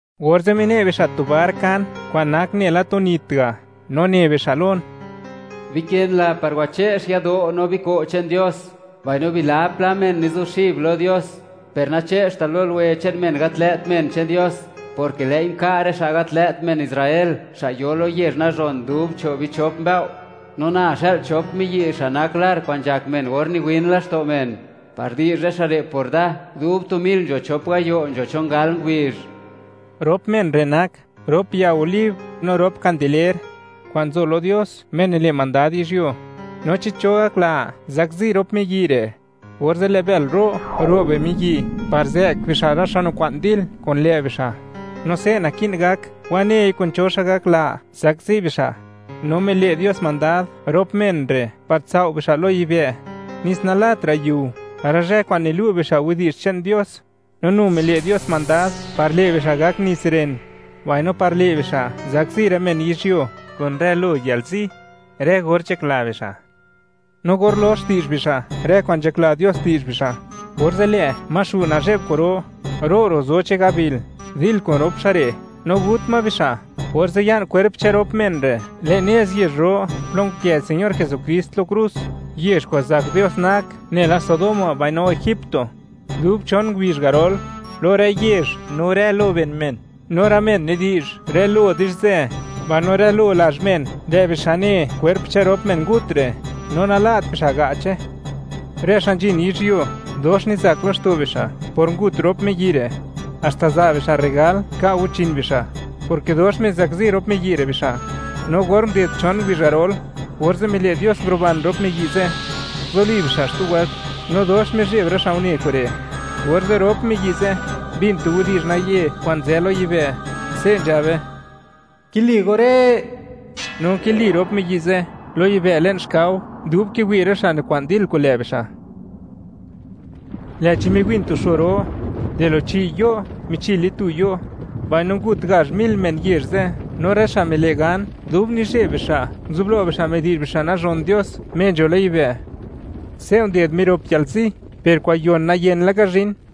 Orze' mine' bixa' tu bar nkan kwa'n nak nela tu nit ga', no ne bixa' lon: ―Bikënla par wache'x yado' no biko' che'n Dios, mbaino bilab pla men nizuxib lo Dios. Per nache'xtal lo luwe che'n men gat lë't men che'n Dios, porke lë'i nka' rë xa' gat lë't men Israel, xa' yo lo yezh nazhon dub cho' bichop mbëo', no na xë'l chop miyi' xa' nak lar kwa'n nzhak men or niwin laxto' men, par di'zh rë xa' re' por da, dub tu mil nzho chop gayo' nzho chon gal ngubizh. Rop men re' nak rop ya olib no rop kandeler kwa'n nzo lo Dios, Me nile' mandad yizhyuo, no chi cho gakla zakzi rop miyi' re', orze' lë' bël ro', ro' bimiyi' par zë'k bixa' rë xa' nikwa'n dil kun lë' bixa'; no se' naki'n gak wanei kun cho xa' gakla, zakzi bixa'. No mile' Dios mandad rop men re' par tsao' bixa' lo yibë', nes nalatra' yiu rë zhë kwa'n nilu' bixa' widi'zh che'n Dios, no nu mile' Dios mandad par le' bixa' gak nits ren, mbaino par le' bixa', zakzi rë men yizhyuo kun rë lo yalzi, rë or nzhakla bixa'. No or lox di'zh bixa' rë kwa'n nzhakla Dios di'zh bixa', orze' lë' ma nazhe'b xu' kwa'ro, ro', ro' zo che'n gabil, dil ma kun rop xa' re', no gut ma bixa'. Orze' ya'n kwerp che'n rop men re' le'n nez yezh ro plo nkë Señor Jesukrist lo krus, yezh kwa'n zak Dios nak nela Sodoma mbaino Egipto. Dub chon ngubizh garol, lo rë yezh no rë lo ben men, no rë men nidi'zh rë lo di'zhzë, mbaino rë lo lazh men; lë' bixa' ne kwerp che'n rop men ngut re', no nala't bixa' ga'che. Rë xa' nzhin yizhyuo, dox nizak laxto' bixa' por ngut rop miyi' re', haxta za' bixa' rregal, ka' guchin bixa', porke dox mizakzi rop miyi' re', bixa'. No or nguded chon ngubizh garol, orze' mile' Dios, nguruban rop miyi' ze', nguzuli bixa' xtu wëlt, no dox mizheb rë xa' une kure'. Orze', rop miyi' ze' mbin tu widi'zh naye kwa'n nzë lo yibë', se' nzhabe: ―¡Kili go re'! No nkili rop miyi' ze' lo yibë' le'n xkao dub kiwi' rë xa' nikwa'n dil kun lë' bixa', lë'chi miwin tu xo ro, di lo chi' yo' michile tu yo'; mbaino ngut gazh mil men yezh ze', no rë xa' mile' gan, dub nizheb bixa', nguzublo bixa' midi'zh bixa' nazhon Dios, Me nzho lo yibë'. Se' nded mirop yalzi, per kwa'n yon nayen laka zhin.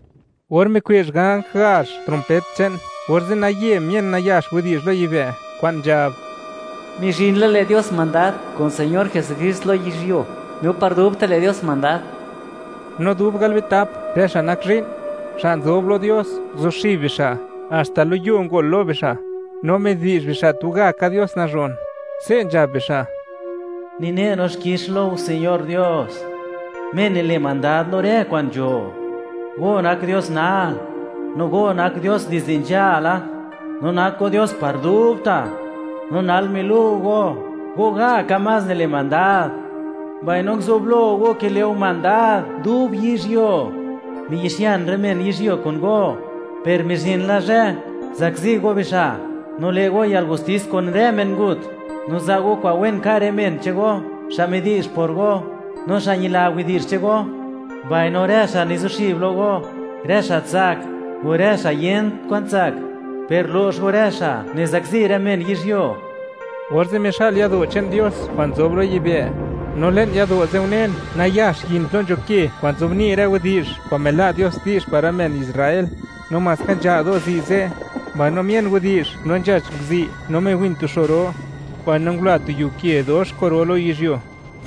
Or mikwe'zh ganj gazh, trompet che'n, orze' naye mien nayax widi'zh lo yibë', kwa'n nzhab: Mizhin la, le' Dios mandad, kun Señor Jesukrist, lo yizhyuo, no par dubta' le' Dios mandad. No dub galbitap rë xa' nak zhi'n, xa' nzob lo Dios, nguzuxib bixa', haxta lo yuo ngol lo bixa', no midi'zh bixa', tugaka Dios nazhon. Se' nzhab bixa': Nine' no xkix Lo Go Señor Dios, Me nile' mandad lo rë kwa'n nzho. Go nak Dios nal, no Go nak Dios dizde nzhala, no nak Go Dios par dubta'. No nal milu' Go, Go gaka más nile' mandad, mbaino nguzublo Go kile' Go mandad dub yizhyuo. Miyi'xian rë men yizhyuo kun Go, per mizhin la zhë, zakzi Go bixa', no le' Go yalgustis kun rë men ngut, no za' Go kwa'n wen ka' rë men che'n Go, xa' midi'zh por Go, no xa' ñila widi'zh che'n Go, mbaino rë xa' nizuxib lo Go, rë xa' tsak, o rë xa' yent kwa'n tsak. Per lo'x Go rë xa' nizakzi rë men yizhyuo. Orze' mixa'l yado' che'n Dios kwa'n nzob lo yibë', no le'n yado' ze' unen, nax yin plo nzho ke kwa'n nzobni' rë widi'zh kwa'n mila' Dios di'zh par rë men Israel; no maska nzha' do'zi' ze', mbaino mien widi'zh no nzhach nguzi', no miwin tu xo ro, mbaino ngula tu yiu ke dox kwa'n ro lo yizhyuo.